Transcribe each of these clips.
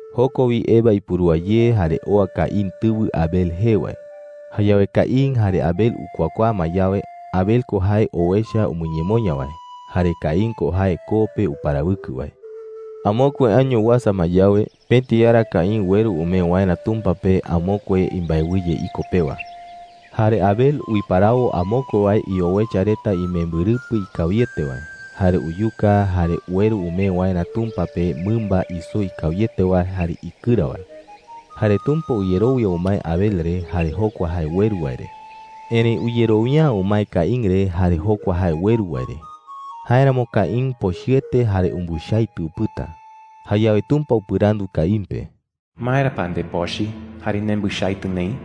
Joko wi Eva ipurúa ye jare oa Caín tɨwɨ Abel jee wae. Jayawe Caín jare Abel ukuakuaa ma yawe, Abel ko jae owecha umɨñemoña wae. Jare Caín ko jae koo pe uparawɨkɨ wae. Amokue año uasa ma yawe, pëti ara Caín ueru umee waerä Tumpa pe amokue imbaewɨye iko pewa. Jare Abel uiparawo amokue wae iowecha reta imembɨrɨpɨ ikawiete wae, jare uyuka, jare ueru umee waerä Tumpa pe mɨmba isoo ikawiete wae jare ikɨra wae. Jare Tumpa uyerowia umae Abel re jare jokua jae ueru wae re. Erëi uyerowia’ä umae Caín re jare jokua jae ueru wae re. Jáeramo Caín pochɨete jare umbɨchaitɨ upɨta. Jayawe Tumpa upɨrandu Caín pe: “¿Maera pa ndepochɨ jare nembɨchaitɨ neï?” jei.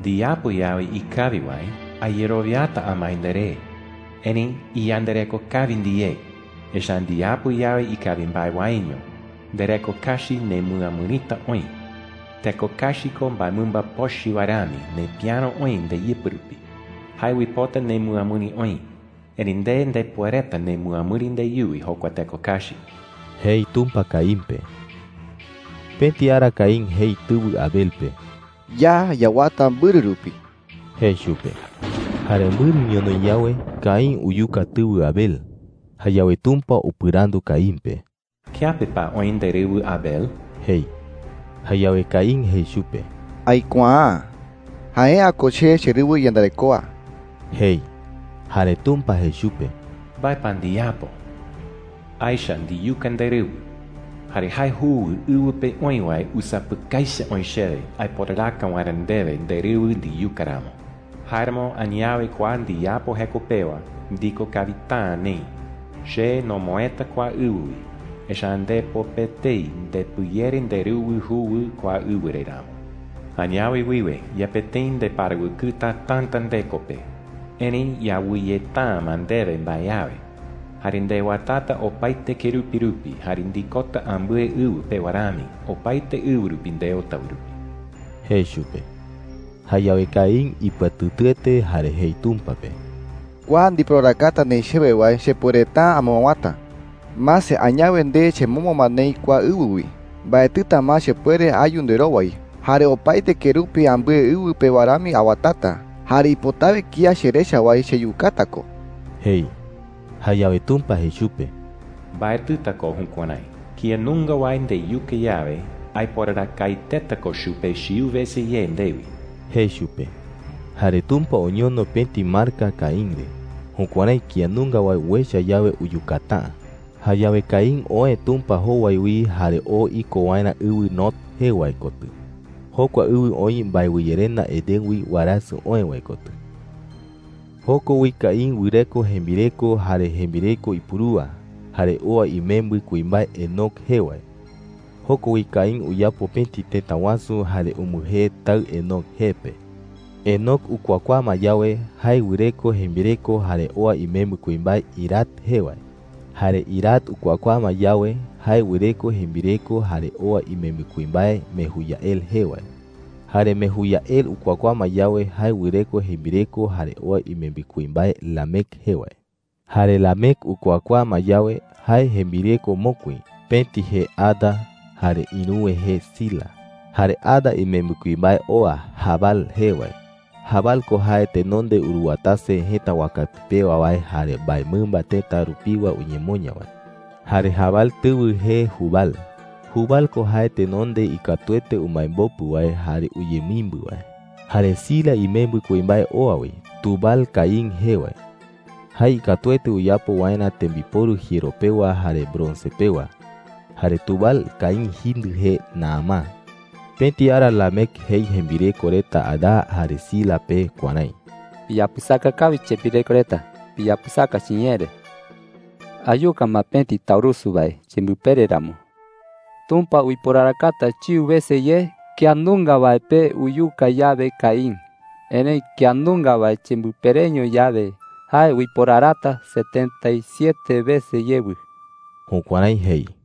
“Ndiyapo yawe ikawi wae, ayerowiata amae nderé. Erëi iyandareko kawi ndiyé, echa’ä ndiyapo yawe ikawi mbae waeño, ndereko kachi nemɨamɨrita oï. Teko kachi ko mbaemɨmba pochɨ wae rami nepiäro oï ndeyɨpɨ rupi. Jae uipota nemɨamɨri oï. Erëi nde ndepuereta nemɨamɨri ndeyuwi jokua teko kachi,” jei Tumpa Caín pe. Pëti ara Caín jei tɨwɨ Abel pe: “Ya yawata mbɨrɨ rupi,” jei chupe. Jare mbɨrɨ ñonoï yawe, Caín uyuka tɨwɨ Abel. Jayawe Tumpa upɨrandu Caín pe: “¿Kiape pa oï nderɨwɨ Abel?” jei. Jayawe Caín jei chupe: “Aikuaa’ä,” jei. “Jae’ä ko che cherɨwɨ iyandarekoa,” jei. Jare Tumpa jei chupe: “¿Mbae pa ndiyapo?” jei. “Aecha ndiyuka nderɨwɨ. Jare jae juwɨ ɨwɨ pe oï wae usapɨkai echa oï chewe aiporaraka waerä ndewe nderɨwɨ ndiyuka ramo,” jei. “Jáeramo, añawe kua ndiyapo jeko pewa, ndiko kawita’ä neï. Che nomoëta kua ɨwɨ wi, echa’ä ndepo pe etei ndepɨyere nderɨwɨ juwɨ kua ɨwɨ re ramo. Añawe wiwe, yepe tëi ndeparawɨkɨta täta ndeko pe, erëi yawɨyeta’ä ma ndewe mbae awe. Jare ndewatata opaete kerupi rupi jare ndikota ambɨe ɨwɨ pewa rami opaete ɨwɨ rupi ndeota wae rupi,” jei chupe. Jayawe Caín ipɨatɨtɨete jare jei Tumpa pe: “Kua ndiporarakata neï chewe wae chepuereta’ä amɨawäta,” jei. “¡Mase! Añawe nde chemombo ma neï kua ɨwɨ wi. Mbaetɨta ma chepuere ayu nderowai. Jare opaete kerupi ambɨe ɨwɨ pewa rami awatata. Jare ipotawe kía cherecha wae cheyukata ko,” jei. Jayawe Tumpa jei chupe: “Mbaetɨta ko jukuärái,” jei. “Kía nunga wae ndeyuka yawe, aiporarakaeteta ko chupe chiu wese ye ndewi,” jei chupe. Jare Tumpa oñono pëti marka Caín re, jukuärái kía nunga wae uecha yawe, uyukata’ä. Jayawe Caín oë Tumpa jowai wi jare oo iko waerä ɨwɨ Nod jee wae kotɨ. Jokua ɨwɨ oï mbaewɨyerenda Edén wi warasɨ oë wae kotɨ. Joko wi Caín wɨreko jembireko jare jembireko ipurúa. Jare oa imembɨ kuimbae Enoc jee wae. Joko wi Caín uyapo pëti tëta wasu jare umbɨjee taɨ Enoc jee pe. Enoc ukuakuaa ma yawe, jae wɨreko jembireko jare oa imembɨ kuimbae Irad jee wae. Jare Irad ukuakuaa ma yawe, jae wɨreko jembireko jare oa imembɨ kuimbae Mejuyael jee wae. Jare Mejuyael ukuakuaa ma yawe, jae wɨreko jembireko jare oa imembɨ kuimbae Lamec jee wae. Jare Lamec ukuakuaa ma yawe, jae jembireko mokui – pëti jee Ada, jare ïruwe jee Zila. Jare Ada imembɨ kuimbae oa, Jabal jee wae. Jabal ko jae tenonde uruwatase jëta wakapi pewa wae jare mbaemɨmba tëta rupiwa umɨñemoña wae. Jare Jabal tɨwɨ jee Jubal. Jubal ko jae tenonde ikatuete umaembopu wae jare uyemimbɨ wae. Jare Zila imembɨ kuimbae oa wi, Tubal-Caín jee wae. Jae ikatuete uyapo waerä tembiporu jiero pewa jare bronce Bronce ko jae pëti jiero iyu wae. pewa. Jare Tubal-Caín jindɨ jee Naamá. Pëti ara Lamec jei jembireko reta Ada jare Zila pe kuärái: “¡Piyapɨsaka kawi, chembireko reta! ¡Piyapɨsaka chiñee re!” jei. “Ayuka ma pëti taurusu wae chembɨpere ramo. Tumpa uiporarakata chiu wese ye kía nunga wae pe uyuka yawe Caín. Erëi kía nunga wae chembɨpereño yawe, jae uiporarata setenta y siete wese yewɨ.” Jukuärái jei.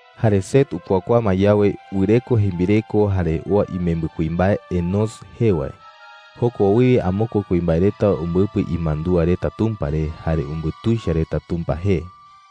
Jare Set ukuakuaa ma yawe, wɨreko jembireko jare oa imembɨ kuimbae Enós jee wae. Joko wiwe amokue kuimbae reta umbɨpɨ imandúa reta Tumpa re jare umbutuicha reta Tumpa jee.